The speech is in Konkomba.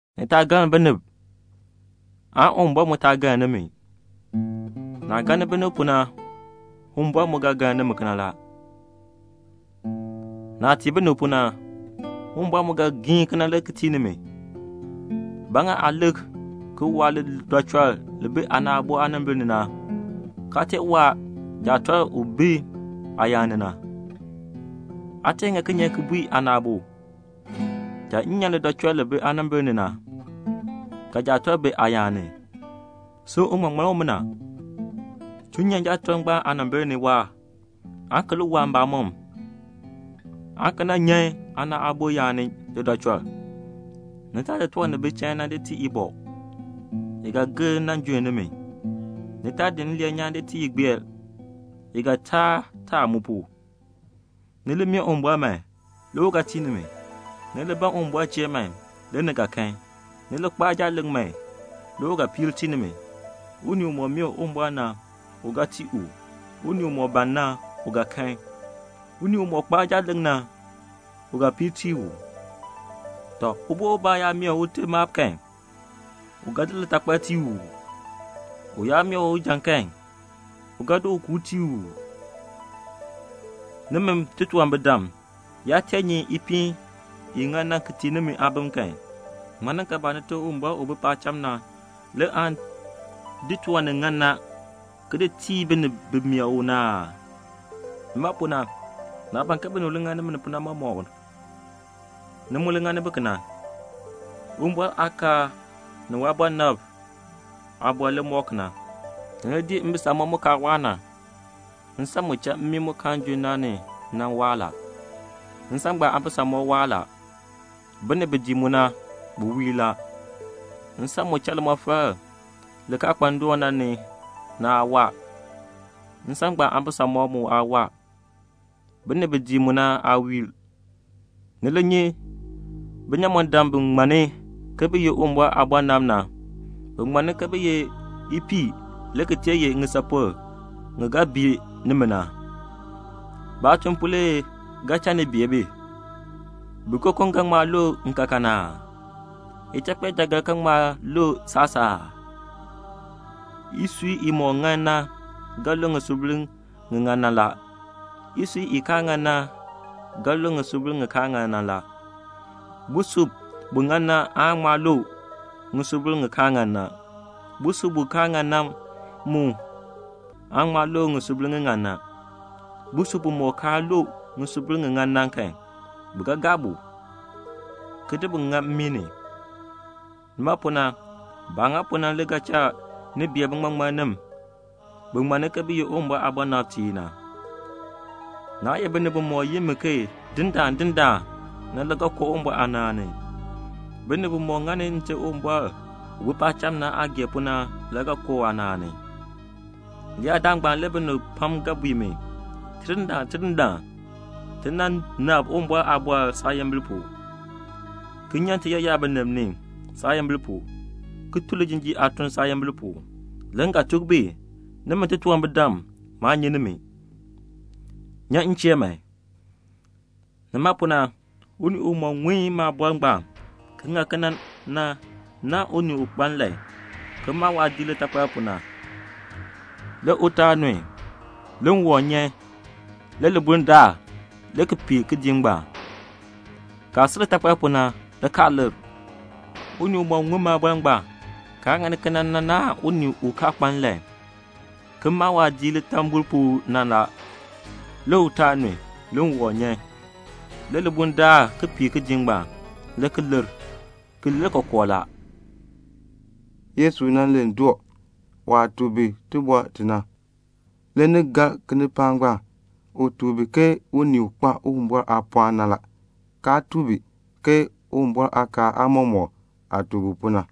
"Ni taa galn binib, aan Uwumbɔr mu taa galn nimi. Naah galni binib pu na, Uwumbɔr mu ga galn nimi kena la. Naah tii binib pu na, Uwumbɔr mu ga giin kena le ki tii nimi. Ba ŋa aa lik ki waa lidɔchɔl li bi aana aabo aanimbil ni na, kaa tee waa jaatɔlk u bi aayaan ni na? Aa tee ŋa kinye ki bui aana aabo, 'Cha m nyan lidɔchɔl li bi aanimbil ni na,' ka jaatɔlk bi aayaan ni? Sin uŋmaŋmann, chuu nyan jaatɔlk ngbaan aanimbil ni waahr, aan ki li waa mbamɔm, aan ki nan nyan aana aabo yaan ni lidɔchɔl. "Ni taa di tiwan ni bi chain na ki di tii ibɔ. I ga gir ki junn nimi. Ni taa di nleen nyaan ki di tii igbeer. I ga taa taa mu pu." "Ni li mee Uwumbɔr man, le u ga tii nimi. Ni li ban Uwumbɔr chee man, le ni ga kan. Ni li kpaa jaaleŋ man, le u ga piir tii nimi. Unii umɔk mee Uwumbɔr na, u ga tii u. Unii umɔk ban na, u ga kan. Unii umɔk kpaa jaaleŋ na, u ga piir tii u. Tɔ, ubo ubaa yaa mee ute maab kan, u ga di litakpal tii u uu? U yaa mee u ujan kan, u ga di ukuub tii u uu? Nimi titunwambirdam yaa tee nyi ipiin i ŋan na ki tii nimi aabim kan, ŋmaninkaabaa Nite Uwumbɔr u bi paacham na le aan di tiwan ni ŋan na ki di tii binib bi mee u na aa? "Nima pu na, naah ban ke binib li ŋani nimi pu na mɔmɔk, ni mu li ŋani bi kena. Uwumbɔr aakaal ni waabɔnabtiib aaliin le mɔk kena." "Ni li dii mbisamɔb mu kaa waa na. Nsan mu cha mmii mu kaan junn na ni, mu waa la. Nsan ngbaan aabisamɔb mu waa la. Binib bi dii mu na, bi wiir la. Nsan mu cha limɔfal li kaa kpa ndoon na, mu aa waa. Nsan ngbaan aabisamɔb mu aa waa. Binib bi dii mu na, baa wiir." "Ni li nyi binyamɔndam bi ŋmanni ke bi ye Uwumbɔr aabɔnabtiib na. Bi ŋmanni ke bi ye ipiih, ki sil ye ŋisapol ŋi ga bii nimi na. Baatuln pu le ga cha ni bee bi. Bikokom ga ŋma lu nkaakan aa? Ichakpeejaagar ga ŋma lu saasaa aa? Isui imɔk ŋan na ga lu ŋisubil ŋi ŋan na la. Isui i kaa ŋan na ga lu ŋisubil ŋi kaa ŋan na la. Busub bu ŋan na aan ŋma lu ŋisubil ŋi kaa ŋan na. Busub bu kaa ŋan na mu aan ŋma lu ŋisubil ŋi ŋan na. Busub bumɔk kaa lu ŋisubil ŋi ŋan na, bi ga gaa bu, ki di ŋa mmii ni. Nima pu na, baah ŋa pu na le ga cha ni bee biŋmaŋmannim bi ŋmanni ke bi ye Uwumbɔr aabɔnabtiib na." "Naa ye binib bimɔk yi mi ke 'Dindaan, Dindaan' na, le ga koo Uwumbɔr aanaan ni. Binib bi ŋani Nte Uwumbɔr u bi paacham na aah gee pu na le ga koo waanaan ni. Leyaadaal ngbaan le binib pam ga bui mi, 'Tidindaan, Tidindaan, ti nan nabr Uwumbɔr aaliin saayimbil pu, ki nyan ni tiyaayar binib ni saayimbil pu, ki tun lijinjiir aatun saayimbil pu.' Le m ga tuk bi, 'Nimi titunwambirdam, maa nyi nimi. Nyan m chee man."' "Nima pu na unii umɔk ŋun maaliin ngbaan ki ŋani kena na, u naahn unii u kpa nlan, ki maa waadiik litakpal pu na. Le utaal nun, le ŋwɔm nyan, le libuln daar, le ki pee kidiik ngbaan. Kaah si litakpal pu na, le kaa lir. "Unii umɔk ŋun maaliin ngbaan, kaa ŋani kena na, u naahn unii u kaa kpa nlan ki maa waadiik litambol pu na. Le utaal nun, le ŋwɔm nyan, le libuln daar ki pee kidiik ngbaan. Le ki lir. Ki lir kookoo la." Le Yesu len doo. Le waah tuk bi iliin i na, ni gar kinipaak ngbaan. U tuk bi ke unii u kpa Uwumbɔr aapɔɔn na la, kaa tuk bi ke Uwumbɔr aakaal aamɔmɔkb aah tuk bi pu na.